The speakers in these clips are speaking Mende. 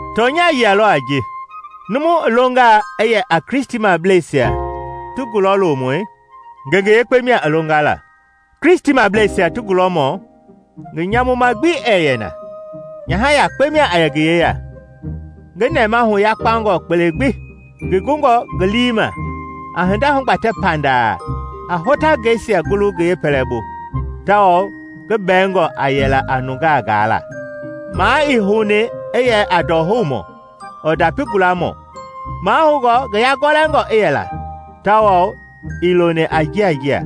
Tɔnya yia lɔ a ji: Numu i longaa i yɛ a Kristimableisia ti gulɔlomui, ngenge yekpe mia i longa la. Kristimableisia ti gulɔmɔ ngi nyamuma gbi ɛɛ yɛ na, nyaha yakpe mia a yɛ ngi yeya, ngi nɛmahu yakpangɔ kpele gbi, ngi gungɔ ngi lii ma, a hinda hugbatɛ pandaa, a hotangɛisia gulu ngi yepɛlɛbu; tawao ngi bɛingɔ a yɛla a nungaa gaala; maa ii houni i yɛ a ndɔhoumɔ ɔɔ ndapi gulamɔ; mahoungɔ ngi yagɔlɛngɔ i yɛ la tawao ii loni a njinjia;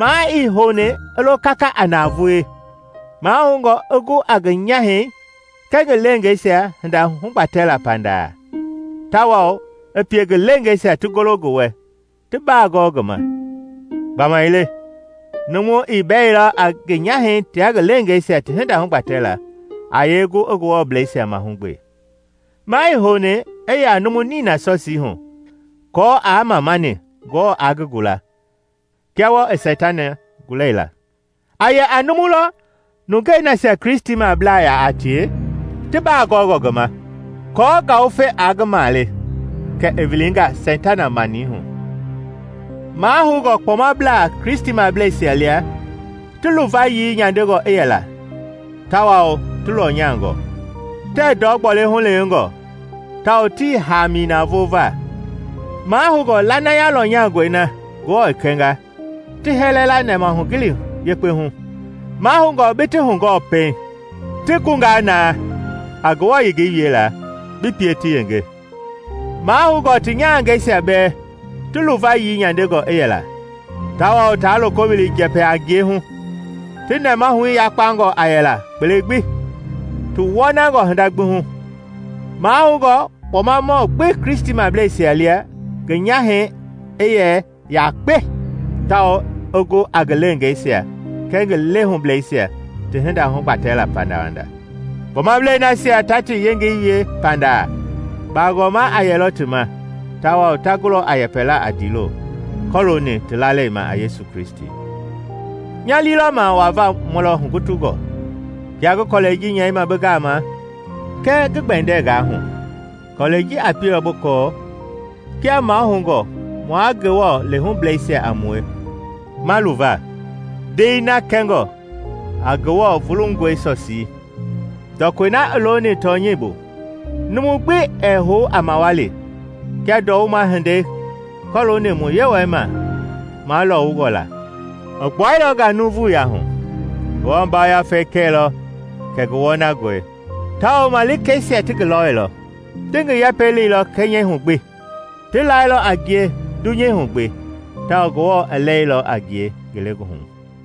maa ii houni i lo kaka a navoei, mahoungɔ i gu a ngi nyahɛi kɛɛ ngi leengeisia hinda hugbatɛlaa pandaa, tawao i pie ngi leengeisia ti golo ngi wɛ ti baa gɔɔ ngi ma. Gbamaile numu ii bɛilɔ a ngi nyahɛi tia ngi leengeisia ti hinda hugbatɛla, a yee gu i Ngewɔblɛisia mahugbe? Maa i houni i yɛ a numu nina sɔsii hu aako aa mamani Ngewɔ aa ngi gula, kia wɔɔ i Seitana gulani la. A yɛ a numu lɔ nungei nasia Kristimabla yaa a tie ti baa gɔɔngɔ ngi ma, aako ngawufe aa ngi male, kɛ i wilinga Seitana mani hu. Mahoungɔ kpɔmablaa Kristimableisia lia ti luvayii nyandengɔ i yɛla tawao ti lɔnyangɔ; tɛɛ ndɔ gbɔle hulewengɔ tawao tii haami navoo va; mahoungɔ lanaya lɔnyangɔi na Ngewɔ i kɛnga ti hɛlɛ la nɛmahugili yekpehu. Mahoungɔ bi ti hugɔɔ pɛiŋ, ti gungaa na a Ngewɔ yengei wiela, bi pie ti yenge. Mahoungɔ ti nyahangɛisia bɛɛ ti luvayii nyandengɔ i yɛla tawao taa loko wili njɛpɛ-a-ngie hu; ti nɛmahui yakpangɔ a yɛla kpele gbi, ti wɔnangɔ hinda gbi hu. Mahoungɔ kpɔmamɔ gbi Kristimableisia lia ngi nyahɛi i yɛ yakpe, tawao i gu a ngi leengeisia kɛɛ ngi lehubleisia ti hinda hugbatɛla pandawanda. Kpɔmablei nasia ta ti yengei wie pandaa, baagɔma a yɛlɔ ti ma tawao ta gulɔ a yɛpɛla a ndiilo kɔlooni ti lalei ma a Yesu Kristi. Nya lii lɔ ma wava mu lɔ hugutungɔ, kia ngi kɔlɛi ji nyɛima bi gama, kɛɛ ngi gbɛndɛnga hu, kɔlɛi ji a pielɔ bi kɔɔ kia mahoungɔ mua Ngewɔ lehubleisia a mue ma luva, ndei na kɛngɔ a Ngewɔ vulungɔe sɔsii, ndɔkɔi na i looni tɔnyɛi bu. Numu gbi ɛɛ hou a mawali kia ndɔwuma hindei kɔlooni mu Yewɔi ma malɔwungɔ la. I gbuailɔ nga nuuvuya hu, Ngewɔ Yafei kɛilɔ kɛ ngi wɔnangɔi tawao malikeisia ti ngi lɔilɔ. Ti ngi yɛpɛi leilɔ kɛnyɛihu gbi, ti lailɔ a ngie dunyeihu gbi, tawao Ngewɔ i lɛilɔ a ngie ngelegoohu